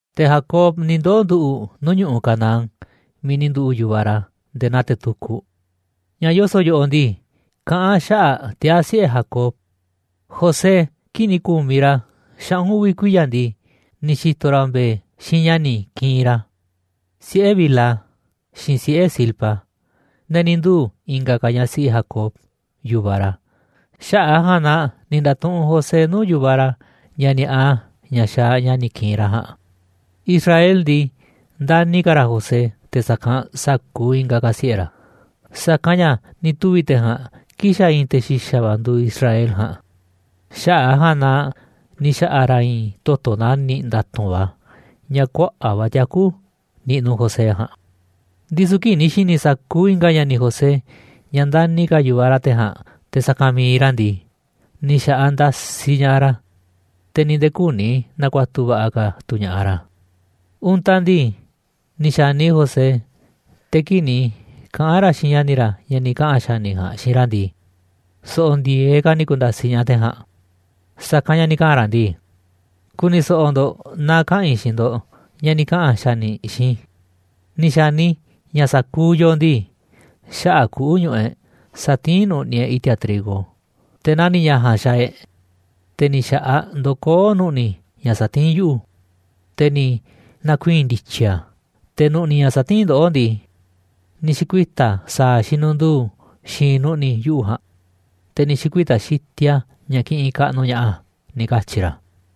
Te̱ Jacob ni̱ ndoo̱ nduꞌu̱ꞌ nuu̱ꞌ ñu̱ꞌuꞌ Canaán miiꞌ ni̱ nduꞌu̱ꞌ yu̱vaꞌ ra̱ nde̱e̱ naa te̱ tukuꞌ. Ña̱ yoso̱ꞌ yoꞌoꞌ ndii, kaꞌán a̱ xaꞌa̱ꞌ tiaa̱ siꞌe̱ Jacob: José, kii̱ꞌ ni̱ ku̱miꞌ ra̱ xaꞌu̱n uvi̱ kuiya̱ ndii, ni̱ xi̱to̱ ra̱ mbe̱e̱ xiinꞌ ña̱ni̱ ki̱i̱n ra̱, siꞌe̱ Bilha xiinꞌ siꞌe̱ Zilpa, ne̱ ni̱ nduu̱ i̱nga̱ ka̱ ñaꞌ siꞌi Jacob, yu̱vaꞌ ra̱. Xaꞌa̱ꞌ a̱ ja̱a̱nꞌ na ni̱ nda̱tuꞌunꞌ José nuu̱ꞌ yu̱vaꞌ ra̱ ña̱ ni̱a̱ꞌa ña̱ xaaꞌ ña̱ni̱ ki̱i̱n ra̱ ja̱a̱nꞌ. Israel ndii, ndani̱ ka̱ ra̱ José te̱ sa̱kanꞌ sa̱kuuꞌ i̱nga̱ ka̱ siꞌe̱ ra̱, sa̱kanꞌ ña̱ ni̱ tuvi̱ te̱ ja̱a̱nꞌ kii̱ꞌ xa̱ i̱i̱n te̱ xi̱xa̱ va̱ nduuꞌ Israel ja̱a̱nꞌ, xaꞌa̱ꞌ a̱ ja̱a̱nꞌ na ni̱ xa̱ꞌa̱ ra̱ i̱i̱n toto̱ nani̱ꞌ nda̱tu̱nꞌ va̱, ña̱ kuaꞌa̱ꞌ va̱ tiaku̱ niꞌnuꞌ José ja̱a̱nꞌ. Ndisu̱ kii̱ꞌ ni̱ xi̱ni̱ sa̱kuuꞌ i̱nga̱ ña̱ni̱ José ña̱ ndani̱ ka̱ yu̱vaꞌ ra̱ te̱ ja̱a̱nꞌ te̱ sa̱kanꞌ mi̱iꞌ ra̱ ndii, ni̱ xa̱ꞌaꞌ ndasiꞌ ña̱ꞌaꞌ ra̱, te̱ ni̱ nde̱e̱ küni na̱ku̱a̱tu̱ va̱ꞌa̱ ka̱ tu̱ ña̱ꞌaꞌ ra̱. Untaꞌ ndii, ni̱ xa̱ni José, te̱ kii̱ꞌ ni̱ kaꞌa̱n ra̱ xiinꞌ ña̱ni̱ ra̱ ña̱ ni̱ kaꞌa̱n xa̱ni̱ ja̱a̱nꞌ xiinꞌ ra̱ ndii, so̱ꞌo̱ ndi̱e̱eꞌ ka̱ ni̱ ku̱nda̱siꞌ ña̱ꞌaꞌ te̱ ja̱a̱nꞌ. Sa̱kanꞌ ña̱ ni̱ kaꞌa̱n ra̱ ndii: ―Ku̱ni̱ so̱ꞌo̱ ndo̱ꞌ na kaꞌa̱n i̱ xiinꞌ ndo̱ꞌ ña̱ ni̱ kaꞌa̱n xa̱ni̱ xiinꞌ i̱. Ni̱ xa̱ni i̱ ña̱ sa̱kuuꞌ yooꞌ ndii, xaꞌa̱ꞌ kuꞌu̱ ñuꞌuꞌ e̱ꞌ satiín nu̱ꞌni̱ e̱ꞌ i̱ti̱a̱ trigo, te̱ nani̱ ña̱ ja̱a̱nꞌ xaaꞌ e̱ꞌ, te̱ ni̱ xa̱ꞌaꞌ ndokoó nu̱ꞌni̱ ña̱ satiín yuꞌu̱, te̱ ni̱ na̱kuii̱n ndi̱tyi̱ a̱, te̱ nu̱ꞌni̱ ña̱ satiín ndoꞌó ndii, ni̱ xi̱kuita̱ a̱ sa̱a̱ xinundu̱u̱ xi̱i̱nꞌ nu̱ꞌni̱ yuꞌu̱ ja̱a̱nꞌ, te̱ ni̱ xi̱kuita̱ xitiꞌ a̱ ña̱ kiꞌinꞌ kaꞌnuꞌ ña̱ꞌaꞌ a̱ ―ni̱ katyi̱ ra̱.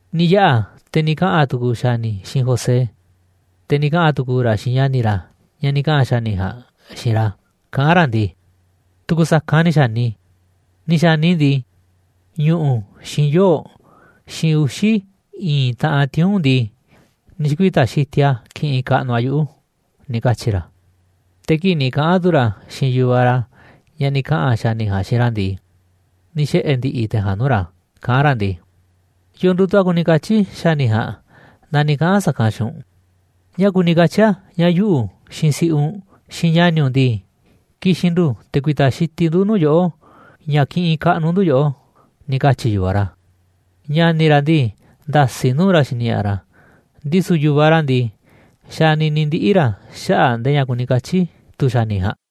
Ni̱ yaꞌa̱ te̱ ni̱ kaꞌa̱n tu̱ku̱u̱ xa̱ni̱ xiinꞌ José, te̱ ni̱ kaꞌa̱n tu̱ku̱u̱ ra̱ xiinꞌ ña̱ni̱ ra̱ ña̱ ni̱ kaꞌa̱n xa̱ni̱ ja̱a̱nꞌ xiinꞌ ra̱. Kaꞌán ra̱ ndii: ―Tu̱ku̱ sa̱kanꞌ ni̱ xa̱ni i̱, ni̱ xa̱ni i̱ ndii, ñu̱ꞌu̱, xiinꞌ yoo̱, xiinꞌ uxi̱ i̱i̱n taꞌan tiuu̱nꞌ ndii, ni̱ xi̱kuita̱ xitiꞌ a̱ kiꞌinꞌ kaꞌnuꞌ a̱ yuꞌu̱ ―ni̱ katyi̱ ra̱. Te̱ kii̱ꞌ ni̱ kaꞌa̱n tu̱ ra̱ xiinꞌ yu̱vaꞌ ra̱ ña̱ ni̱ kaꞌa̱n xa̱ni̱ ja̱a̱nꞌ xiinꞌ ra̱ ndii, ni̱ xiꞌe̱ ndi̱ꞌi̱ te̱ ja̱a̱nꞌ nuu̱ꞌ ra̱ kaꞌán ra̱ ndii: ―¿Yo̱o̱ nduuꞌ tu̱ a̱ kuni katyi̱ xa̱ni̱ ja̱a̱nꞌ na ni̱ kaꞌa̱n a̱ sa̱kanꞌ xiinꞌ u̱nꞌ? ¿Ñáá kuni katyi̱ a̱ ña̱ yuꞌu̱, xiinꞌ si̱ꞌiꞌ u̱nꞌ, xiinꞌ ña̱ni̱ u̱nꞌ ndii, ki̱xi̱n ndu̱ te̱ ku̱i̱ta̱ xitiꞌ ndu̱ nuu̱ꞌ yoꞌó, ña̱ kiꞌinꞌ kaꞌnuꞌ ndu̱ yoꞌó? ―ni̱ katyi̱ yu̱vaꞌ ra̱. Ña̱ni̱ ra̱ ndii, nda̱si̱ nuu̱ꞌ ra̱ xini ña̱ꞌaꞌ ra̱, ndisu̱ yu̱vaꞌ ra̱ ndii, xanini ndiꞌni̱ ra̱ xaꞌa̱ꞌ ndee ña̱ kuni katyi̱ tu̱ xa̱ni̱ ja̱a̱nꞌ.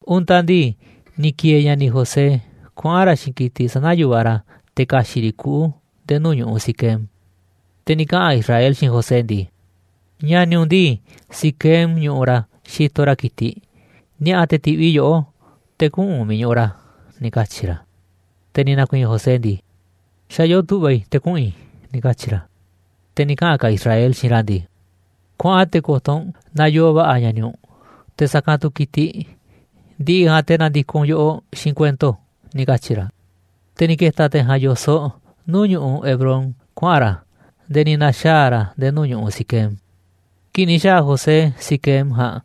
Untaꞌ ndii, ni̱ ki̱e̱e̱ ña̱ni̱ José kuaꞌa̱n ra̱ xiinꞌ ki̱tiꞌ sana̱ yu̱vaꞌ ra̱ te̱ ka̱xi̱ꞌ riꞌ kuꞌu̱ nde̱e̱ nuu̱ꞌ ñu̱ꞌuꞌ Siquem. Te̱ ni̱ kaꞌa̱n Israel xiinꞌ José ndii: ―Ña̱ni̱ u̱nꞌ ndii, Siquem ñuꞌuꞌ ra̱ xitoꞌ ra̱ ki̱tiꞌ, ni̱a̱ꞌa̱ te̱ ti̱ꞌviꞌ i̱ yoꞌó, te̱ kuꞌu̱n u̱nꞌ miiꞌ ñuꞌuꞌ ra̱ ―ni̱ katyi̱ ra̱. Te̱ ni̱ na̱ku̱i̱i̱n José ndii: ―Xa̱ yoo tu̱ꞌva̱ i̱ te̱ kuꞌu̱n i̱ ―ni̱ katyi̱ ra̱. Te̱ ni̱ kaꞌa̱n ka̱ Israel xiinꞌ ra̱ ndii: ―Kuaꞌan te̱ ko̱to̱ u̱nꞌ naaꞌ yoo va̱ꞌa̱ ña̱ni̱ u̱nꞌ, te̱ sa̱kanꞌ tu̱ ki̱tiꞌ, ndi̱ꞌi̱ ja̱a̱nꞌ te̱ na̱ndi̱koꞌ u̱nꞌ yoꞌoꞌ xiinꞌ kuento ―ni̱ katyi̱ ra̱. Te̱ ni̱ ke̱ta̱ te̱ ja̱a̱nꞌ yo̱soꞌ nuu̱ꞌ ñu̱ꞌuꞌ Hebrón kuaꞌa̱n ra̱ nde̱e̱ ni̱ na̱xaa̱ ra̱ nde̱e̱ nuu̱ꞌ ñu̱ꞌuꞌ Siquem. Kii̱ꞌ ni̱ xa̱a̱ José Siquem ja̱a̱nꞌ,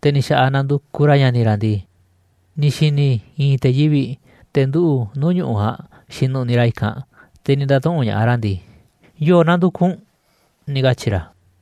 te̱ ni̱ xa̱ꞌaꞌ nandukuꞌ ra̱ ña̱ni̱ ra̱ ndii, ni̱ xi̱ni̱ i̱i̱n te̱ yivi̱ꞌ, te̱ nduꞌu̱ꞌ nuu̱ꞌ ñu̱ꞌuꞌ ja̱a̱nꞌ xinuꞌniꞌ ra̱ i̱kanꞌ, te̱ ni̱ nda̱tuꞌu̱nꞌ ña̱ꞌaꞌ ra̱ ndii: ―¿Yo̱o̱ nandukuꞌ u̱nꞌ? ―ni̱ katyi̱ ra̱.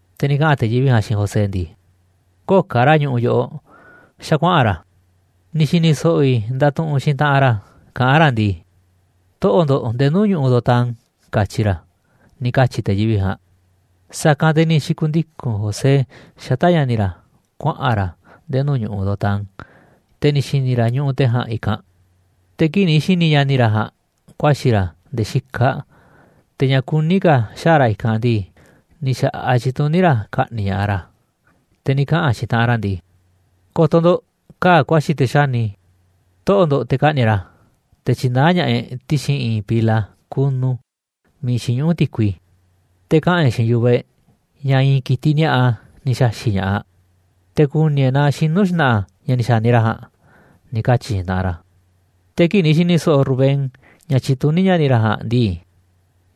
Te̱ ni̱ kaꞌa̱n te̱ yivi̱ꞌ ja̱a̱nꞌ xiinꞌ José ndii: ―Köo̱ꞌ ka̱ ra̱ ñuꞌuꞌ yoꞌoꞌ, xa̱ kuaꞌa̱n ra̱, ni̱ xi̱ni̱ so̱ꞌo̱ i̱ ndatuꞌunꞌ xiinꞌ taꞌanꞌ ra̱, kaꞌán ra̱ ndii: “Toꞌo̱ꞌ ndo̱ꞌ nde̱e̱ nuu̱ꞌ ñu̱ꞌuꞌ Dotán”, katyi̱ ra̱ ―ni̱ katyi̱ te̱ yivi̱ꞌ ja̱a̱nꞌ. Sa̱kanꞌ te̱ ni̱ xi̱ku̱ndiku̱n José xata̱ꞌ ña̱ni̱ ra̱ kuaꞌa̱n ra̱ nde̱e̱ nuu̱ꞌ ñu̱ꞌuꞌ Dotán, te̱ ni̱ xi̱ni̱ ra̱ ñuꞌuꞌ te̱ ja̱a̱nꞌ i̱kanꞌ. Te̱ kii̱ꞌ ni̱ xi̱ni̱ ña̱ni̱ ra̱ ja̱a̱nꞌ ku̱a̱xi̱ ra̱ nde̱e̱ xikaꞌ, te̱ ña̱ kuní ka̱ xaa̱ ra̱ i̱kanꞌ ndii, ni̱ xa̱ꞌaꞌ tyituní ra̱ ka̱ꞌni̱ꞌ ña̱ꞌaꞌ ra̱. Te̱ ni̱ kaꞌa̱n xiinꞌ taꞌanꞌ ra̱ ndii: ―Ko̱to̱ ndo̱ꞌ, kaa̱ꞌ kuaxi̱ te̱ xáni. Toꞌo̱ꞌ ndo̱ꞌ te̱ ka̱ꞌni̱ꞌ e̱ꞌ ra̱, te̱ tyi̱naá ña̱ꞌaꞌ e̱ꞌ ti̱xi̱n i̱i̱n pila kunu miiꞌ xiñuꞌú ti̱kui, te̱ kaꞌa̱n e̱ꞌ xiinꞌ yu̱vaꞌ e̱ꞌ ña̱ i̱i̱n ki̱tiꞌ ni̱a̱ꞌa ni̱ xa̱xi̱ꞌ ña̱ꞌaꞌ, te̱ ku̱ni̱ e̱ꞌ naaꞌ xinu̱ xna̱ꞌa̱ ña̱ ni̱ xa̱ni ra̱ ja̱a̱nꞌ ―ni̱ katyi̱ xiinꞌ taꞌanꞌ ra̱. Te̱ kii̱ꞌ ni̱ xi̱ni̱ so̱ꞌo̱ Rubén ña̱ tyituní ña̱ni̱ ra̱ ja̱a̱nꞌ ndii,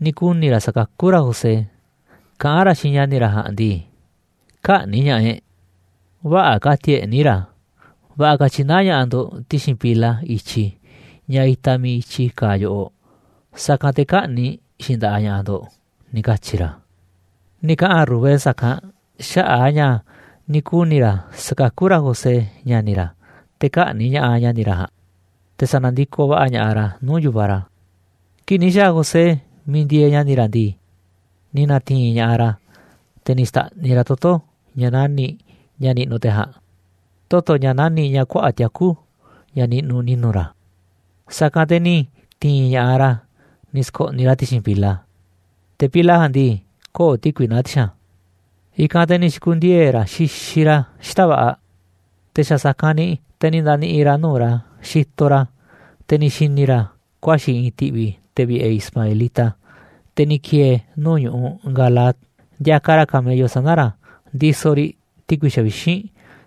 ni̱ kuni̱ ra̱ sa̱kakú ra̱ José, kaꞌán ra̱ xiinꞌ ña̱ni̱ ra̱ ja̱a̱nꞌ ndii: ―Kä̱ꞌni̱ꞌ ña̱ꞌaꞌ e̱ꞌ, vä̱ꞌa̱ ka̱ti̱a̱ e̱ꞌ níiꞌ ra̱, va̱ꞌa̱ ka̱ tyi̱naá ña̱ꞌaꞌ ndo̱ꞌ ti̱xi̱n pila i̱tyi, ña̱ itaꞌ miiꞌ i̱tyi kaaꞌ yoꞌoꞌ, sa̱kanꞌ te̱ kä̱ꞌni̱ꞌ xiinꞌ nda̱ꞌaꞌ ña̱ꞌaꞌ ndo̱ꞌ ―ni̱ katyi̱ ra̱. Ni̱ kaꞌa̱n Rubén sa̱kanꞌ xaꞌa̱ꞌ a̱ ña̱ ni̱ kuni̱ ra̱ sa̱kakú ra̱ José, ña̱ni̱ ra̱, te̱ kä̱ꞌni̱ꞌ ña̱ꞌaꞌ ña̱ni̱ ra̱ ja̱a̱nꞌ, te̱ sa̱na̱ndikoꞌ va̱ꞌa̱ ña̱ꞌaꞌ ra̱ nuu̱ꞌ yu̱vaꞌ ra̱. Kii̱ꞌ ni̱ xa̱a̱ José miiꞌ ndieeꞌ ña̱ni̱ ra̱ ndii, ni̱ na̱ti̱i̱n ña̱ꞌaꞌ ra̱, te̱ ni̱ xta̱ꞌniꞌ ra̱ toto̱, ña̱ nani̱ꞌ, ña̱ niꞌnuꞌ te̱ ja̱a̱nꞌ, toto̱ ña̱ nani̱ꞌ ña̱ kuaꞌa̱ꞌ tiaku̱, ña̱ niꞌnuꞌ ni̱nu̱ ra̱, sa̱kanꞌ te̱ ni̱ ti̱i̱n ña̱ꞌaꞌ ra̱ ni̱ sko̱ꞌniꞌ ra̱ ti̱xi̱n pila, te̱ pila ja̱a̱nꞌ ndii, köo̱ꞌ ti̱kui naá ti̱xi̱n a̱. I̱kanꞌ te̱ ni̱ xi̱ku̱ndiee̱ ra̱ xixiꞌ ra̱ xita̱ꞌ va̱ꞌa̱. Te̱ xa̱ sa̱kanꞌ ni̱ te̱ ni̱ nda̱ni̱ꞌi̱ ra̱ nuu̱ꞌ ra̱ xitoꞌ ra̱, te̱ ni̱ xi̱ni̱ ra̱ ku̱a̱xi̱ i̱i̱n ti̱ꞌvi̱ te̱ vi̱ꞌe̱ ismaelita, te̱ ni̱ ki̱e̱e̱ nuu̱ꞌ ñu̱ꞌuꞌ Galaad, ndiakaꞌ ra̱ camello sana̱ ra̱ ndisoꞌ riꞌ ti̱kui xavixínꞌ,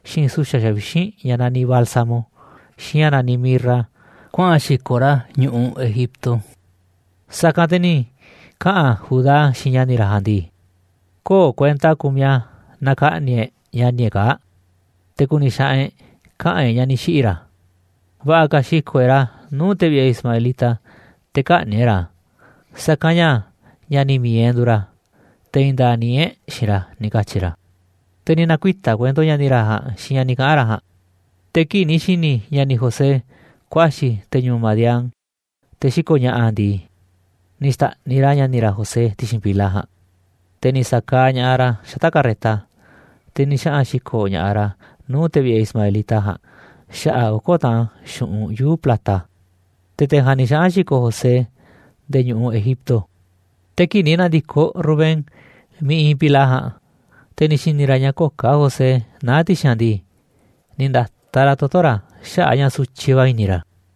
xiinꞌ su̱xa̱ xavixínꞌ ña̱ naniꞌ bálsamo, xiinꞌ ña̱ naniꞌ mirra, kuaꞌa̱n xi̱ko̱ ra̱ a̱ ñu̱ꞌuꞌ Egipto. Sa̱kanꞌ te̱ ni̱ kaꞌa̱n Judá xiinꞌ ña̱ni̱ ra̱ ja̱a̱nꞌ ndii: ―Köo̱ꞌ kuenta kumiꞌ a̱ naaꞌ ka̱ꞌni̱ꞌ e̱ꞌ ña̱ni̱ e̱ꞌ kaa̱ꞌ, te̱ ku̱ni̱ xaꞌanꞌ e̱ꞌ kaꞌa̱n e̱ꞌ ña̱ ni̱ xiꞌi̱ ra̱. Va̱ꞌa̱ ka̱ xi̱ko̱ꞌ e̱ꞌ ra̱ nuu̱ꞌ te̱ vi̱ꞌe̱ ismaelita te̱ kä̱ꞌni̱ꞌ e̱ꞌ ra̱, sa̱kanꞌ ña̱ ña̱ni̱ mi̱iꞌ e̱ꞌ nduuꞌ ra̱, te̱ i̱i̱n nda̱a̱ꞌ níiꞌ e̱ꞌ xiinꞌ ra̱ ―ni̱ katyi̱ ra̱. Te̱ ni̱ na̱kuita̱ kuento ña̱ni̱ ra̱ ja̱a̱nꞌ xiinꞌ ña̱ ni̱ kaꞌa̱n ra̱ ja̱a̱nꞌ. Te̱ kii̱ꞌ ni̱ xi̱ni̱ ña̱ni̱ José kuaxi̱ te̱ ñu̱u̱ Madián, te̱ xiko̱ꞌ ña̱ꞌa̱ ndii, ni̱ xta̱ꞌniꞌ ra̱ ña̱ni̱ ra̱ José ti̱xi̱n pila ja̱a̱nꞌ, te̱ ni̱ sa̱kaaꞌ ña̱ꞌaꞌ ra̱ xata̱ꞌ carreta, te̱ ni̱ xaꞌa̱n xi̱ko̱ ña̱ꞌaꞌ ra̱ nuu̱ꞌ te̱ vi̱ꞌe̱ ismaelita ja̱a̱nꞌ xaꞌa̱ꞌ oko̱ taꞌan xu̱ꞌunꞌ yuu̱ꞌ plata. Te̱ te̱ ja̱a̱nꞌ ni̱ xaꞌa̱n xi̱ko̱ꞌ José nde̱e̱ ñu̱ꞌuꞌ Egipto. Te̱ kii̱ꞌ ni̱ na̱ndi̱koꞌ Rubén miiꞌ iinꞌ pila ja̱a̱nꞌ, te̱ ni̱ xi̱ni̱ ra̱ ña̱ köo̱ꞌ ka̱ José naá ti̱xi̱n a̱ ndii, ni̱ nda̱taꞌ ra̱ toto̱ ra̱ xaꞌa̱ꞌ a̱ ña̱ sutyiꞌ va̱ i̱ni̱ ra̱.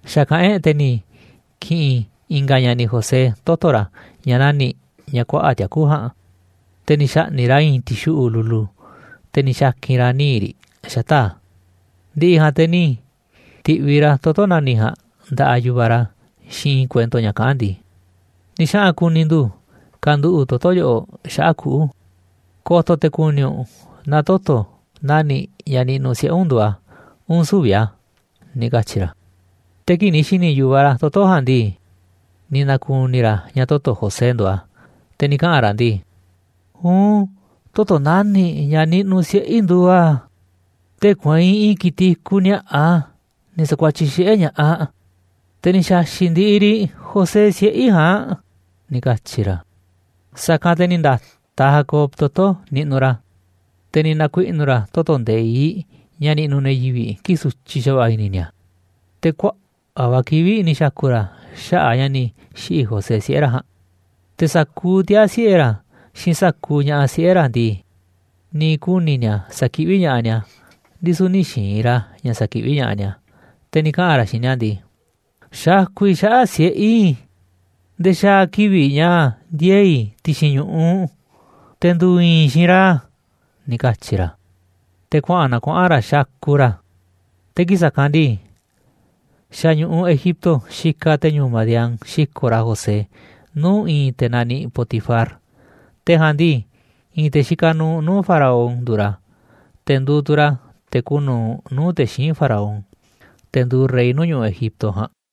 Xa̱kaꞌán e̱ꞌ te̱ ni̱ ki̱ꞌi̱n i̱nga̱ ña̱ni̱ José toto̱ ra̱ ña̱ nani̱ꞌ, ña̱ kuaꞌa̱ꞌ tiaku̱ ja̱a̱nꞌ, te̱ ni̱ xa̱ꞌni̱ꞌ ra̱ i̱i̱n ti̱xuꞌu̱ꞌ lulu, te̱ ni̱ xa̱ki̱n ra̱ níiꞌ riꞌ xata̱ꞌ a̱. Ndi̱ꞌi̱ ja̱a̱nꞌ te̱ ni̱ ti̱ꞌviꞌ ra̱ toto̱ nani̱ꞌ ja̱a̱nꞌ nda̱ꞌaꞌ yu̱vaꞌ ra̱ xiinꞌ i̱i̱n kuento ña̱ kaꞌán ndii: ―Ni̱ xaꞌa̱n ku̱ni̱ ndu̱ kanduꞌu̱ꞌ toto̱ yoꞌoꞌ xaꞌa̱ꞌ kuꞌu̱, ko̱to̱ te̱ ku̱ni̱ u̱nꞌ naaꞌ toto̱ nani̱ꞌ ña̱ niꞌnuꞌ siꞌe̱ u̱nꞌ nduuꞌ a̱, uun sü̱vi̱ a̱ ―ni̱ katyi̱ ra̱. Te̱ kii̱ꞌ ni̱ xi̱ni̱ yu̱vaꞌ ra̱ toto̱ ja̱a̱nꞌ ndii, ni̱ na̱ku̱ni̱ ra̱ ña̱ toto̱ José nduuꞌ a̱, te̱ ni̱ kaꞌa̱n ra̱ ndii: ―Uun, toto̱ nani̱ꞌ ña̱ niꞌnuꞌ siꞌe̱ i̱ nduuꞌ a̱. Tee̱ꞌ kueinꞌ i̱i̱n ki̱tiꞌ i̱kuꞌ ni̱a̱ꞌa, ni̱ sa̱kuatyiꞌ xiꞌe̱ ña̱ꞌaꞌ. Te̱ ni̱ xa̱xi̱ꞌ ndiꞌiꞌ riꞌ José siꞌe̱ i̱ ja̱a̱nꞌ ―ni̱ katyi̱ ra̱. Sa̱kanꞌ te̱ ni̱ nda̱taꞌ Jacob toto̱ niꞌnuꞌ ra̱, te̱ ni̱ na̱kuiꞌnu̱ ra̱ toto̱ nde̱iꞌ ña̱ niꞌnuꞌ ne̱ yivi̱ꞌ kii̱ꞌ sutyiꞌ xa̱va̱ꞌa̱ i̱ni̱ ni̱a̱, te̱ kuaꞌa̱ꞌ va̱ kivi̱ꞌ ni̱ xa̱ku̱ ra̱ xaꞌa̱ꞌ a̱ ña̱ ni̱ xiꞌi̱ José siꞌe̱ ra̱ ja̱a̱nꞌ. Te̱ sa̱kuuꞌ tiaa̱ siꞌe̱ ra̱, xiinꞌ sa̱kuuꞌ ña̱ꞌaꞌ siꞌe̱ ra̱ ndii, ni̱ kuni̱ ni̱a̱ sa̱kiꞌví ña̱ꞌaꞌ ni̱a̱, ndisu̱ nï̱ xi̱i̱n ra̱ ña̱ sa̱kiꞌví ña̱ꞌaꞌ ni̱a̱. Te̱ ni̱ kaꞌa̱n ra̱ xiinꞌ ni̱a̱ ndii: ―Xakuꞌ i̱ xaꞌa̱ꞌ siꞌe̱ i̱ nde̱e̱ xaa̱ kivi̱ꞌ ña̱ ndiee̱ i̱ ti̱xi̱n ñu̱ꞌuꞌ, te̱ ndu̱u̱ i̱i̱n i̱ xiinꞌ ra̱ ―ni̱ katyi̱ ra̱. Te̱ kuaꞌa̱n na kuaꞌa̱n ra̱ xakuꞌ ra̱. Te̱ kii̱ꞌ sa̱kanꞌ ndii, xa̱ ñu̱ꞌuꞌ Egipto xikaꞌ te̱ ñu̱u̱ madián xiko̱ꞌ ra̱ José nuu̱ꞌ i̱i̱n te̱ naniꞌ Potifar, te̱ ja̱a̱nꞌ ndii, i̱i̱n te̱ xikaꞌ nuuꞌ nuu̱ꞌ Faraón nduuꞌ ra̱, te̱ nduuꞌ tu̱ ra̱ te̱ kuuꞌ nu̱uꞌ nuu̱ꞌ te̱ xíinꞌ Faraón, te̱ nduuꞌ rey nuu̱ꞌ ñu̱ꞌuꞌ Egipto ja̱a̱nꞌ.